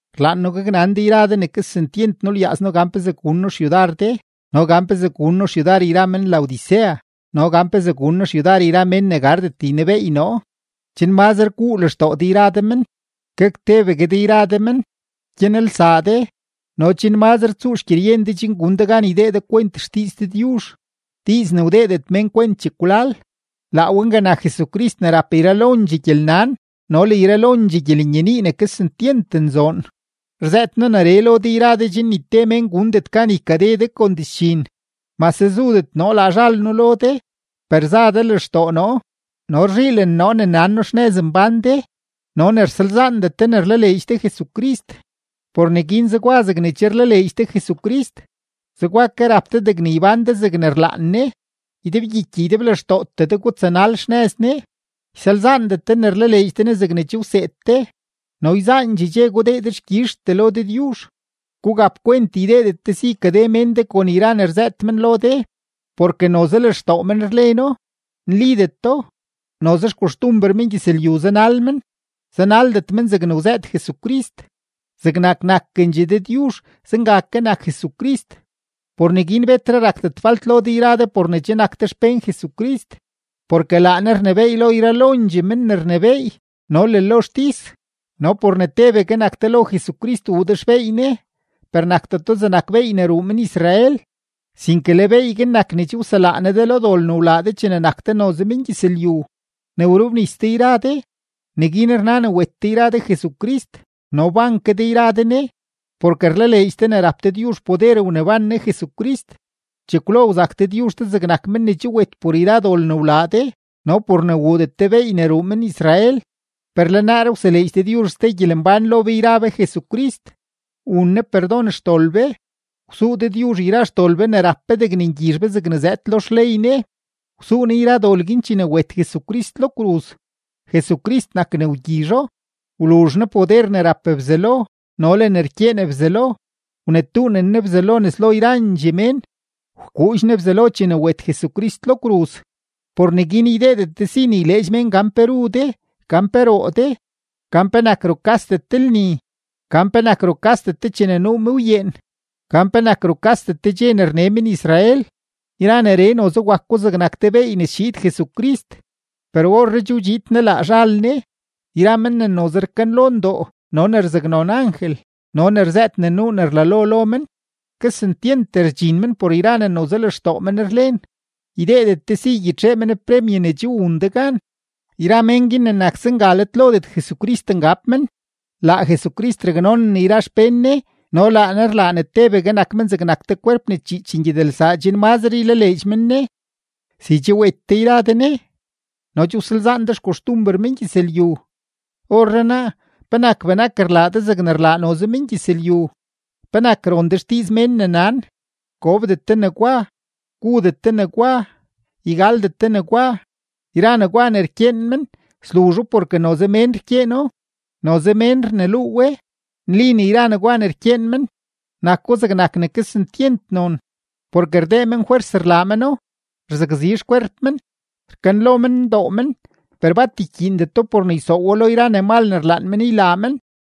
Rlaan noo gaknan de yra de ne kesentyent nulyaaz noo gan pezee gun noo xyudar de no gan pezee gun noo xyudar yra men-Laodicea no gan pezee gun noo xyudar yra mén ne gardet ynebeey noo, chen mazre guu lextoo de yra de men, gak tebegue de yra de men, gyanelsaa de no chen mazre tsuu xgyeryen de chen gun de gan ydee de kwent xdiiz Dëdyuzh, diiz ne wdeedet mén kwent chekwlal; laa we nga nak Jesucrist ne rap yralondxee gyelnan no le yralondxee gyelenyenii ne kesentyent nzoon. Rzëët noo neree lo de yra de chen ni te mén gundet gan ykade de kon dizdxin. Mase zudet noo laa zhal noo lo de, per za de lextoo noo no rzhiilen noo ne nan noo ne xnëz mbán de no ne rsalzaandet de ne rlaleedx de Jesucrist. Por neguin zegwa zegne che rlaleedx de Jesucrist, zegwa ke rap de degne ybán de zegne rlaan Ne. Ydebgyiky ydeblextootee de gutsanal xnëz Ne, ysalzaandet de ne rlaleedx de Ne zegne che wseed de no yzaandxee dxe gudee dexkyizhtee lo Dëdyuzh. Gugap kwent ydeedet de si ykade mén de kon yra ne rzëët men lo de, porke noze lextoo men rleno, nlideto, noze xkoxtumber mengyëzlyu zanal men, zanaldet men zegne wzëët Jesucrist. Zegnak nakendxegue Dëdyuzh, zenga ke nak Jesucrist. Por neguin betre rakdet falt lo de yra de por ne che nak de xpén Jesucrist, porke laa Ne rnebééy lo yralondxee men ne rnebééy no le lo xtis. No por ne tebegue nak de lo Jesucrist wuu de xbeey Ne, per nakdeto zegnak beey ne ruu men-Israel, sinke le beey guin nak ne che wselaa Ne de lo dol ne wlaa de chene nak de noze mengyëzlyu. Ne wrobnis de yra de, neguin rna ne wet de yra de Jesucrist no wban ke de yra de Ne, porke rlaleedx de ne rap Dëdyuzh poder wneban Ne Jesucrist. Chekwlo wzak Dëdyuzh de zegnak men ne che wet por yra dol ne wlaa de no por ne wuudet de beey ne ruu men-Israel. Per le naaree wseleedx Dëdyuzh ste gyelembán lo be yra be Jesucrist, wun Ne perdon xdol be. Wsuu Dëdyuzh yra xdol be ne rap be degne ngyizh be zegne zëëd lo xley Ne, wsuu Ne yra dol guin chene wet Jesucrist lo kruz, Jesucrist nak ne wgyizho. Wluzh Ne poder ne rap Bzelo no le ne rkyeen Bzelo; wnetuunen Ne Bzelo nes lo yrandxee mén, wkuudx Ne Bzelo chene wet Jesucrist lo kruz. Por neguin ydeedet de si ne yleedx mén gan pe ru de, gan pe roo de, gan penak rukasdet de lni, gan penak rukasdet de chene nuu mëwyeen, gan penak rukasdet de dxe ne rne men-Israel. Yra neree noze wako zegnak te beey ne schiid Jesucrist, per orree che wdxiid Ne laa zhal Ne. Yra men ne noze rkanlo ndoo no ne rzaknon angel no ne rzëët ne nuu ne rlalo lo men, kesentyent rdxin men por yra ne noze lextoo men rlen; ydeedet de si ygyitxee men premye ne che wun de gan. Yra mén guin ne nak zenga let lodet Jesucrist ngab men. Laa Jesucrist raknonen yra xpén Ne no laa Ne rlaa ne tebegue nak men zegnak te kwerp ne chiich ngyedelsaa chen mazre ylaleedx men Ne. Si che wet de yra de Ne no che wsalzaan de xkoxtumber mengyëzlyu, orrenaa, ¿penak benak rlaa de zegne rlaa noze mengyëzlyu? ¿Penak ron de xdiiz mén ne nan: “Gobdet de negwa, gudet de negwa, ygaldet de negwa”? Yra negwa ne rkyeen men, sluzho porke noze mén rkyeeno, noze mén rneluu we. Nli ne yra negwa ne rkyeen men, nako zegnak ne kesentyent non, porke rdee men fwers rlaa meno, rzakzi xkwerp men, rkanlo men ndoo men, per bat ykyiindeto por ne ysoowo lo yra ne mal ne rlaan men ylaa men.